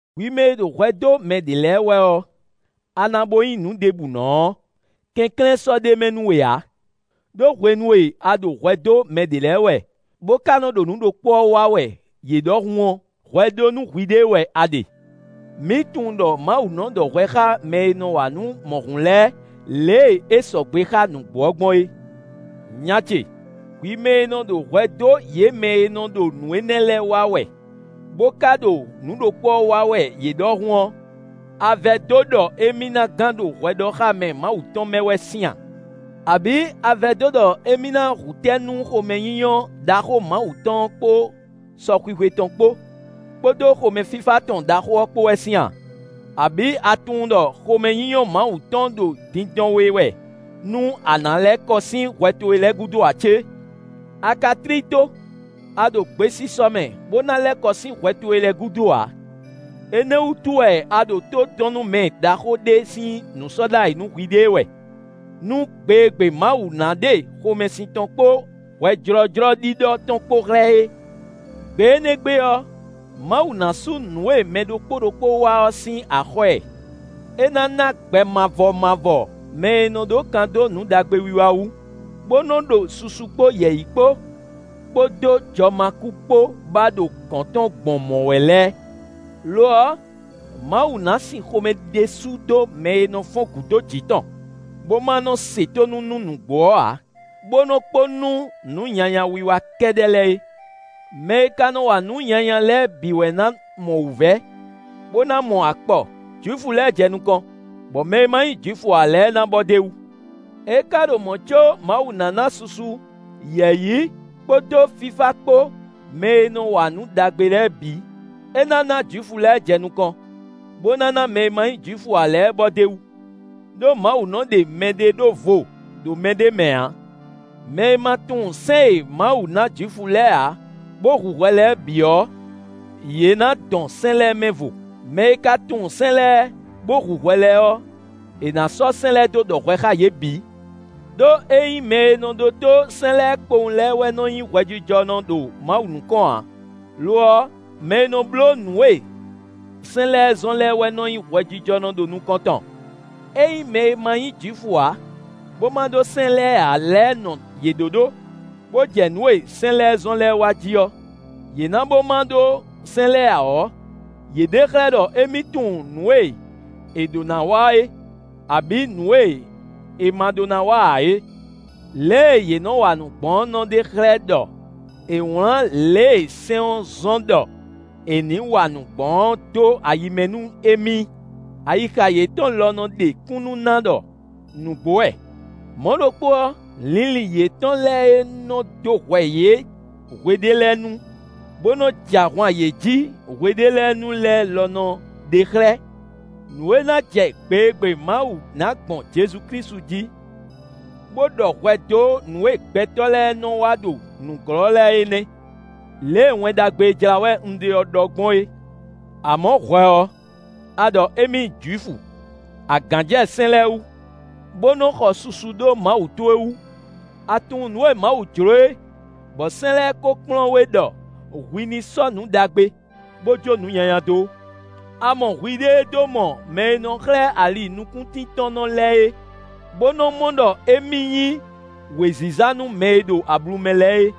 Hwi mɛ e ɖo hwɛ dó mɛ ɖě lɛ́ɛ wɛ ɔ́, a na bo nyí nǔ ɖěbǔnɔ ɔ́, kɛnklɛ́n sɔ́ ɖ'é mɛ nú we ǎ; ɖó hwenu e a ɖo hwɛ dó mɛ ɖě lɛ́ɛ wɛ, bó ka nɔ ɖo nǔ ɖokpó ɔ́ wa wɛ yě ɖɔhun ɔ́, hwɛ ɖó nú hwiɖée wɛ a ɖe. Mǐ tunwun ɖɔ Mawu nɔ ɖɔ hwɛ xá mɛ e nɔ wa nǔ mɔ̌hun lɛ́ɛ lě e é sɔgbe xá nǔgbó ɔ́ gbɔn é. Nya ce, hwi mɛ e nɔ ɖo hwɛ dó yě mɛ e nɔ ɖo nǔ énɛ́ lɛ́ɛ wa wɛ, bó ka ɖo nǔ ɖokpó ɔ́ wa wɛ yě ɖɔhun ɔ́, a vɛdó ɖɔ émí ná gán ɖo hwɛɖɔxámɛ Mawu tɔn mɛ wɛ sín a? Abǐ a vɛdó ɖɔ émí ná hu tɛ́ nú xomɛnyínyɔ́ ɖaxó Mawu tɔn ɔ́ kpó sɔxwixwe tɔn kpó, kpódó xomɛfífá tɔn ɖaxó ɔ́ kpó wɛ sín a? Abǐ a tunwun ɖɔ xomɛnyínyɔ́ Mawu tɔn ɖo dindɔn we wɛ nú a na lɛ́ kɔ sín hwɛ towe lɛ́ɛ gúdo ǎ cé? A ka tlí tó; a ɖo gbesisɔ mɛ bó ná lɛ́ kɔ sín hwɛ towe lɛ́ɛ gúdo ǎ; énɛ́ wútu wɛ a ɖo tó dɔn nú mɛ ɖaxó ɖé sín nǔ sɔ́ ɖ'ayǐ nú hwiɖée wɛ nú gbe e gbe Mawu ná ɖe xomɛsin tɔn kpó hwɛjlɔ́jlɔ́ ɖiɖɔ tɔn kpó xlɛ́ é. Gbe énɛ́ gbe ɔ́, Mawu ná sú nǔ e mɛ ɖokpó ɖokpó wa ɔ́ sín axɔ́ ɛ. É ná ná gbɛ mavɔ mavɔ mɛ e nɔ ɖó kan dó nǔ ɖagbe wiwa wú, bó nɔ́ ɖo susu kpó yɛ̌yi kpó, kpódó jɔmakú kpó ba ɖo gɔ̌n tɔn gbɔn mɔ̌ wɛ lɛ́ɛ. Lo ɔ́, Mawu ná sin xomɛ ɖésú dó mɛ e nɔ fɔ́n gǔ dó jǐ tɔn, bó ma nɔ́ se tónú nú nǔgbó ɔ́ ǎ, bó nɔ́ kpo nú nǔ nyanya wiwa kɛ́ɖɛ́ lɛ́ɛ é. Mɛ e ka nɔ wa nǔ nyanya lɛ́ɛ bǐ wɛ ná mɔ wǔvɛ́, bó ná mɔ akpɔ: Jwifu lɛ́ɛ jɛ nukɔn, bɔ mɛ e ma nyí Jwifu ǎ lɛ́ɛ ná bɔ d'é wú. É ka ɖo mɔ̌ có Mawu ná ná susu, yɛ̌yi, kpódó fífá kpó mɛ e nɔ wa nǔ ɖagbe lɛ́ɛ bǐ. É ná ná Jwifu lɛ́ɛ jɛ nukɔn, bó ná ná mɛ e ma nyí Jwifu ǎ lɛ́ɛ bɔ d'é wú. Đó Mawu nɔ ɖe mɛɖé ɖó vo ɖo mɛ ɖé mɛ ǎ. Mɛ e ma tunwun sɛ́n e Mawu ná Jwifu lɛ́ɛ ǎ, bó hu hwɛ lɛ́ɛ bǐ ɔ́, yě ná dɔn sɛ́n lɛ́ɛ mɛvo; mɛ e ka tunwun sɛ́n lɛ́ɛ, bó hu hwɛ lɛ́ɛ ɔ́, è nǎ sɔ́ sɛ́n lɛ́ɛ dó ɖɔ hwɛ xá yě bǐ. Đó ényí mɛ e nɔ ɖótó sɛ́n lɛ́ɛ kpowun lɛ́ɛ wɛ nɔ nyí hwɛjijɔnɔ ɖo Mawu nukɔn ǎ; lo ɔ́, mɛ e nɔ bló nǔ e sɛ́n lɛ́ɛ zɔ́n lɛ́ɛ wɛ nɔ nyí hwɛjijɔnɔ ɖo nukɔn tɔn. Ényí mɛ e ma nyí Jwifu ǎ, bó ma ɖó sɛ́n lɛ́ɛ ǎ lɛ́ɛ nɔ yě ɖóɖó, bó jɛ nǔ e sɛ́n lɛ́ɛ zɔ́n lɛ́ɛ wa jí ɔ́, yě na bo ma ɖó sɛ́n lɛ́ɛ ǎ ɔ́, yě ɖe xlɛ́ ɖɔ émí tunwun nǔ e è ɖǒ ná wa é, abǐ nǔ e è ma ɖó ná wa ǎ é. Lě e yě nɔ wa nǔ gbɔn ɔ́ nɔ ɖe xlɛ́ ɖɔ è wlǎn lě e sɛ́n ɔ́ zɔ́n ɖɔ è nǐ wa nǔ gbɔn ɔ́ dó ayi mɛ nú émí. Ayixa yětɔn lɔ nɔ ɖe kúnnu ná ɖɔ nǔgbó wɛ; mɔ̌ ɖokpó ɔ́, linlin yětɔn lɛ́ɛ e nɔ dó hwɛ yě hwe ɖé lɛ́ɛ nu, bó nɔ jɛ ahwan yě jí hwe ɖ'é lɛ́ɛ nu lɛ́ɛ lɔ nɔ ɖe xlɛ́. Nǔ e ná jɛ gbe e gbe Mawu ná gbɔn Jezu Klísu jí, bó ɖɔ hwɛ dó nǔ e gbɛtɔ́ lɛ́ɛ nɔ wa ɖo nǔglɔ́ lɛ́ɛ é nɛ́, lě e Wɛn Ɖagbe e jlá wɛ un ɖe ɔ́ ɖɔ gbɔn é. Amɔ̌, hwɛ ɔ́, a ɖɔ émí nyí Jwifu; a gǎn jɛ sɛ́n lɛ́ɛ wú, bó nɔ xɔ susu ɖó Mawu towe wú. A tunwun nǔ e Mawu jló é, bɔ sɛ́n lɛ́ɛ kó kplɔ́n we ɖɔ hwi ní sɔ́ nǔ ɖagbe, bó jó nǔ nyanya dó. A mɔ hwiɖée dó mɔ mɛ e nɔ xlɛ́ ali nukúntíntɔ́nnɔ lɛ́ɛ é, bó nɔ́ mɔ ɖɔ émí nyí wěziza nú mɛ e ɖo ablu mɛ lɛ́ɛ é.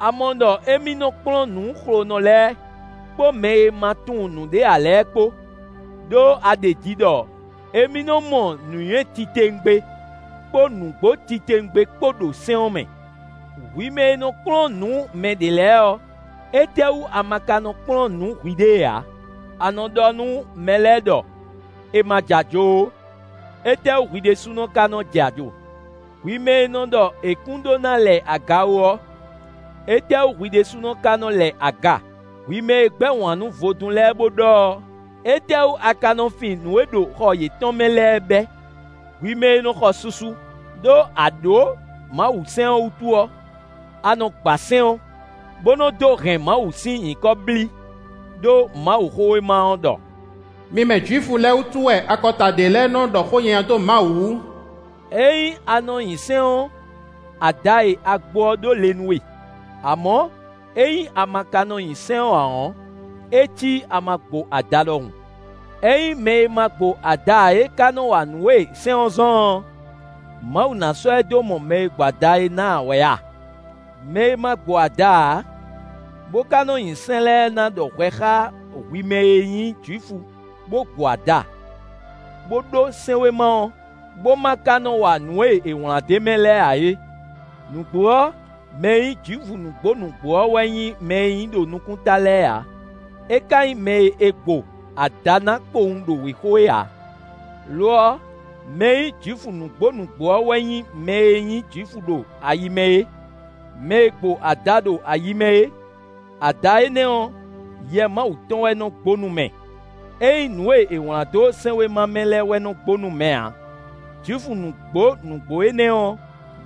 A mɔ ɖɔ émí nɔ́ kplɔ́n nǔ xlonɔ lɛ́ɛ, kpó mɛ e ma tunwun nǔɖé ǎ lɛ́ɛ kpó, ɖó a ɖeji ɖɔ émí nɔ́ mɔ nǔnywɛ́ titewungbe kpó nǔgbó titewungbe kpó ɖo sɛ́n ɔ́ mɛ. Hwi mɛ e nɔ kplɔ́n nǔ mɛ ɖě lɛ́ɛ ɔ́, étɛ́ wú a ma ka nɔ kplɔ́n nǔ hwiɖée ǎ? A nɔ ɖɔ nú mɛ lɛ́ɛ ɖɔ è ma jɛ ajo ó; étɛ́wú hwi ɖésúnɔ ka nɔ jɛ ajo? Hwi mɛ e nɔ ɖɔ è kún ɖó ná lɛ aga ó ɔ́, étɛ́ wú hwi ɖésúnɔ ka nɔ lɛ aga? Hwi mɛ e gbɛ́ wǎn nú vodún lɛ́ɛ bo ɖɔ ɔ́, étɛ́ wú a ka nɔ fin nǔ e ɖo xɔ yětɔn mɛ lɛ́ɛ bɛ́? Hwi mɛ e nɔ xɔ susu ɖó a ɖǒ Mawusɛ́n ɔ́ wútu ɔ́, a nɔ gba sɛ́n ɔ́, bó nɔ dó hɛn Mawu sín nyǐkɔ blí. Đó Mawuxówéma ɔ́ ɖɔ: “Mi mɛ Jwifu lɛ́ɛ wútu wɛ akɔta ɖě lɛ́ɛ nɔ́ ɖɔ xó nyanya dó Mawu wú.” Ényí a nɔ nyi sɛ́n ɔ́, ada e a gbo ɔ́ ɖó le nú we. Amɔ̌, ényí a ma ka nɔ nyi sɛ́n ɔ́ ǎ ɔ́, é cí a ma gbo ada ɖɔhun. Ényí mɛ e ma gbo ada ǎ é ka nɔ wa nǔ e sɛ́n ɔ́ zɔ́n ɔ́, Mawu ná sɔ́ ɛ dó mɔ mɛ e gbo ada é ná ǎ wɛ a? Mɛ e ma gbo ada ǎ, bó ka nɔ nyi sɛ́n lɛ́ɛ na ɖɔ hwɛ xá hwi mɛ e nyí Jwifu bo gbo ada, bó ɖó sɛ́nwéma ɔ́, bó ma ka nɔ wa nǔ e è wlán d'é mɛ lɛ́ɛ ǎ é. Nǔgbó ɔ́, mɛ e nyí Jwifu nǔgbó nǔgbó ɔ́ wɛ nyí mɛ e nyí ɖo nukún ta lɛ́ɛ ǎ; é ka nyí mɛ e è gbo ada ná kpowun ɖo wěxo é ǎ. Lo ɔ́, mɛ e nyí Jwifu nǔgbó nǔgbó ɔ́ wɛ nyí mɛ e nyí Jwifu ɖo ayi mɛ é, mɛ e gbo ada ɖo ayi mɛ é. Ada énɛ́ ɔ́, Yɛ Mawu tɔn wɛ nɔ gbo nú mɛ; ényí nǔ e è wlán dó sɛ́nwéma mɛ lɛ́ɛ wɛ nɔ́ gbo nú mɛ ǎ. Jwifu nǔgbó nǔgbó énɛ́ ɔ́,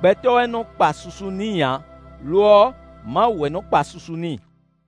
gbɛtɔ́ wɛ nɔ kpa susu n'i ǎ, lo ɔ́, Mawu wɛ nɔ́ kpa susu n'i.